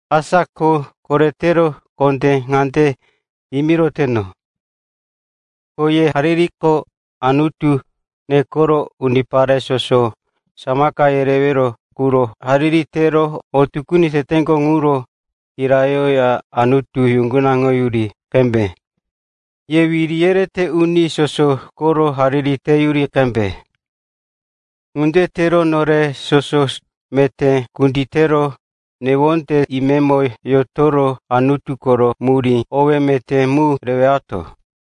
Asa ko koretero kondé ŋande yimiroteno, ko ye haririko Anutu nekero unipare soso samaka yerewero quro hariri tero o tukuni teteŋgo ŋuro kirayoya Anutu yuŋgunaŋoyuri qembe. Ye wiri yerete uni soso koro hariri teyuri qembe. Ŋunde tero nore soso meté kunditero, newonde imemo yotoro, Anutu koro murí howero, owé meté mu rewato.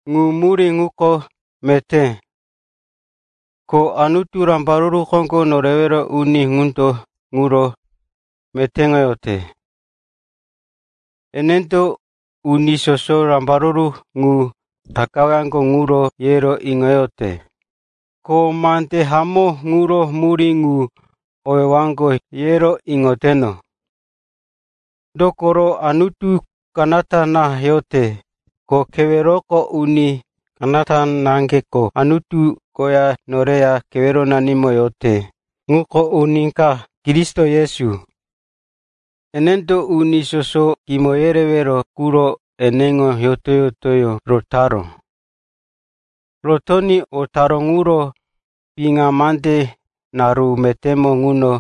Ŋu murí ŋuko meté, ko Anutu, Rambaruru Koŋgo Norewero Uni ŋundo ŋuro metéŋoyote. Enendo uni soso rambaruru ŋu takawaŋgo ŋuro yero iŋoyote, ko mande hamó ŋuro murí ŋu iŋowaŋgo, yero iŋoyote. Dokoro Anutu kanata na yote. Kowe keweroko uni kanata naŋgeko Anutu koya noreya keweronanimo yote, ŋuko uni ka, Kristo Yesu. Enendo uni soso kimo yerewero quro eneŋo yoto-yotoyó rotaró. Rotoní o taró ŋuro piŋa mande naru metémo ŋuno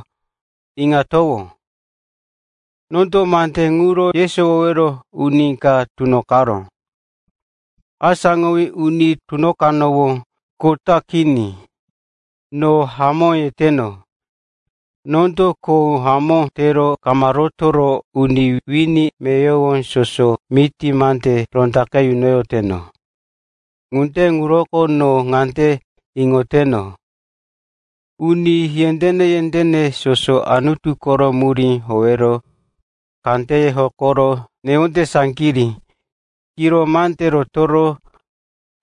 iŋatowó. Nondo mande ŋuro yesowowero uni ka tunoqero, asáŋowí uni tunoqanowó. Kota kini, no hamó yeteno. Nondo kho hamó tero kama rotoro uni wini meyowo soso miti mande rondaqe yunoyoteno. Ŋunde ŋuroko no ŋande iŋoteno, uni yendéne-yendéne soso Anutu koro murí howero kandeye hokoro newonde saŋgirí, kiro mande rotoro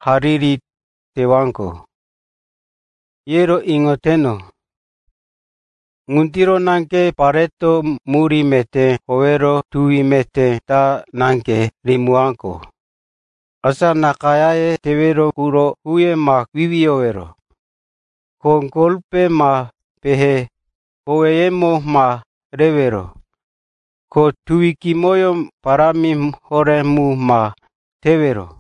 hariri tewaŋgo, yero iŋoteno. Ŋundiro naŋge pareto murí meté howero tuwi meté ta naŋge rimiwaŋgo. Asa nakayáye tewero quro huye ma wiwiyowero, ko golpe ma pehe koweyemo ma rewero, ko tuwi kimoyó parámi horé mu ma tewero.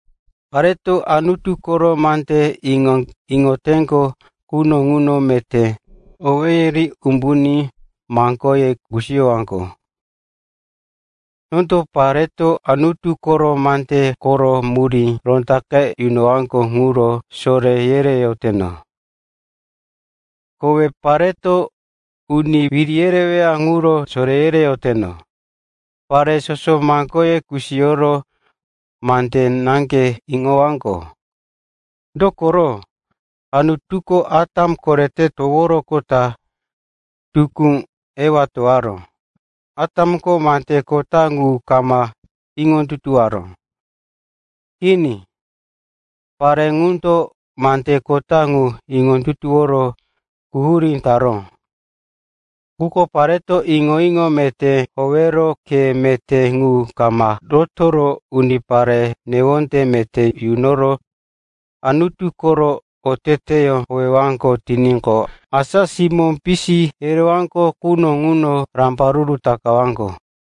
Pareto Anutu koro mande iŋoteŋgo quno ŋuno meté owéye ri umbuní maŋgoye kusiyowaŋgo. Nondo pareto Anutu koro mande koro murí rondaqe yunowaŋgo ŋuro soré yereyoteno. Kowe pareto uni wiri yereweya ŋuro soré yereyoteno. Pare soso maŋgoye kusiyoro mande naŋge iŋowaŋgo. Dokoro Anutuko Atam korete toworoqota, tukú Ewa towaró. Atamko mande kota ŋu kama iŋondutuwoyaró. Kini. Pare ŋundo mande kota ŋu iŋondutuworo quhurí taró. Quko pareto iŋo-iŋo meté howero khe meté ŋu kama rotoro, unipare newonde meté yunoro, Anutu koro oteteyó howeyowaŋgo tiníqo, asa simó pisi yerewaŋgo quno ŋuno rambaruru takawaŋgo.